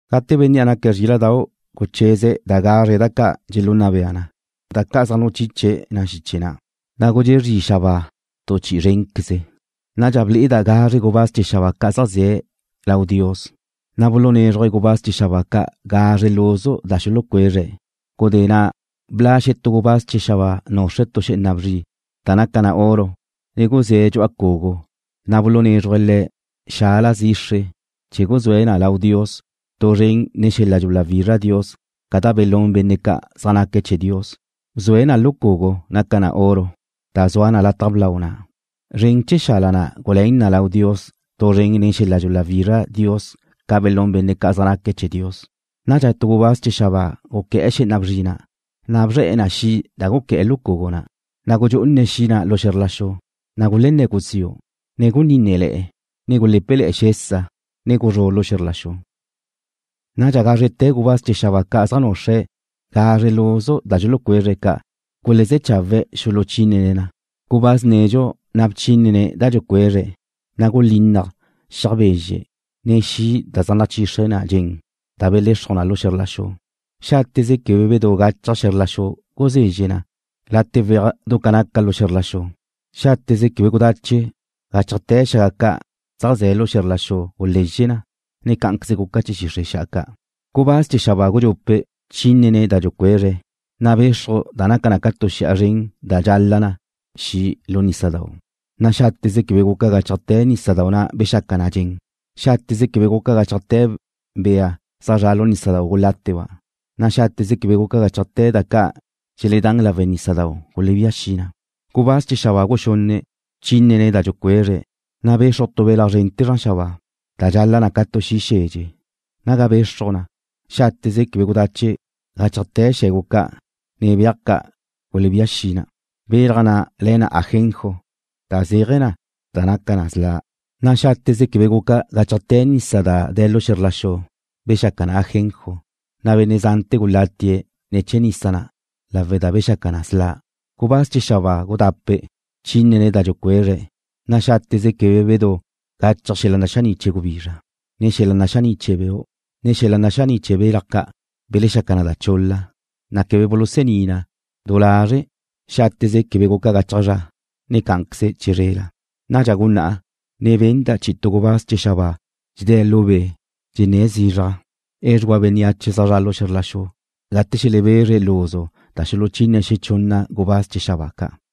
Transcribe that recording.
Gate Bénnea' naque̱' Zríla'dau' gucheze̱' da gazre da ca' dxelunna bea na, da ca' zaj nuchiche na xiche na', na' gudxé' zri xabáa tu chi'i zrénqueze. Nadxa ble'eda' gazre gubáz chee̱ xabáa ca' zaj ze̱' lau Dios, na' bulunézruje̱' gubáz chee̱ xabáa ca' gazre luzu da xulucuezre̱'. Gudé na' bla' xetú gubáz chee̱ xabáa nuxre̱' tu xé'ena bzri da naca na oro ne guzé̱' dxu'a cugu, na' bulunézrujle̱'e̱ le̱' xala zixre chee̱ guzúe̱' na lau Dios tu zren nen xel-la' dxuláwizra Dios ca' da belún benne' ca' zaj naque̱' chee̱ Dios. Bzue̱' na lu cugu naca na oro, da zua na lau lataj blau na'. Zren chee̱ xala na' guluén na lau Dios tu zren nen xel-la' dxuláwizra Dios ca' belún benne' ca' zaj naque̱' chee̱ Dios. Nadxa tu gubáz chee̱ xabáa guqué̱'e̱ xé'ena bzri na', na' bzre̱'e̱ na xi' da guqué̱'e̱ lu cugu na', na' gudxú'une̱' xi' na' lu xe̱zr la xu, na' gulenné̱ guziu', ne gulenínnele̱'e̱, ne gulé̱pele̱'e̱ xesa, ne guzrú' xe̱zr la xu. Nadxa gázrete̱ gubáz chee̱ xabáa ca' zaj nuxre̱' gazre luzu da dxulucuezre̱' gulezé̱ chawe̱' xuluchínene̱' na. Gubáz nedxu na' bchínene̱' da dxucuezre̱', na' gulinnaj xiaj bezxe', ne xi' da zaj nachixre na dxen da belexruj na lu xe̱zr la xu. Xáteze quebe bedú gachaj xe̱zr la xu guzezxe na late weaj du ca naca lu xe̱zr la xu. Xáteze quebe gudache gáchajte̱ xaga ca' zaj ze̱ lu xe̱zr la xu gulezxe na, ne cá'anqueze guca chee̱ xixre' xa'a ca'. Gubáz chee̱ xabáa gudxupe' bchínene̱' da dxucuezre̱', na' bexruj da naca na ca tu xi'a zren da dxala na xi' lu nísadau', na' xáteze quebe guca gáchajte̱ nísadau' na' bexaca na dxen. Xáteze quebe guca gáchajte̱ bea zaj zraba' lu nísadau' guláteba', na' xáteze quebe guca gáchajte̱ da ca' dxeledán lawe' nísadau' gulebía xi na. Gubáz chee̱ xabáa guxunne' bchínene̱' da dxucuezre̱', na' bexruj tu belaj zrente̱ zran xabáa, da dxala na ca tu xi' xedxe. Naga bexruj na, xáteze quebe gudache gáchajte̱ xe̱gu ca', ne beaj ca' gulebía xi na. Belaj na' le̱ na Ajenjo, da zéaje̱ na da naca na sla', na' xáteze quebe guca gáchajte̱ nisa da de̱ lu xe̱zr la xu bexaca na ajenjo, na' benne' zante̱ gulatie̱' ne̱ chee̱ nisa na' lawe' da bexaca na sla'. Gubáz chee̱ xabáa gudape' bchínene̱' da dxucuezre̱', na' xáteze quebe bedú gachaj xel-la' naxaní' chee̱ gubizra, ne xel-la' naxaní' chee̱ beu', ne xel-la' naxaní' chee̱ belaj ca' belexaca na chul-la, na' quebe bulusení na du lazre' xáteze quebe guca gachaj zra, ne cá'anqueze che zrela. Nadxa gunná'a, ne benda' chi'i tu gubáz chee̱ xabáa dxedé̱' lu be', dxenné̱' zizraj: ―Edxugua bénneache zaj zra' xe̱zr la xu gate xelebezre luzu da xuluchine xechunna gubáz chee̱ xabáa ca'.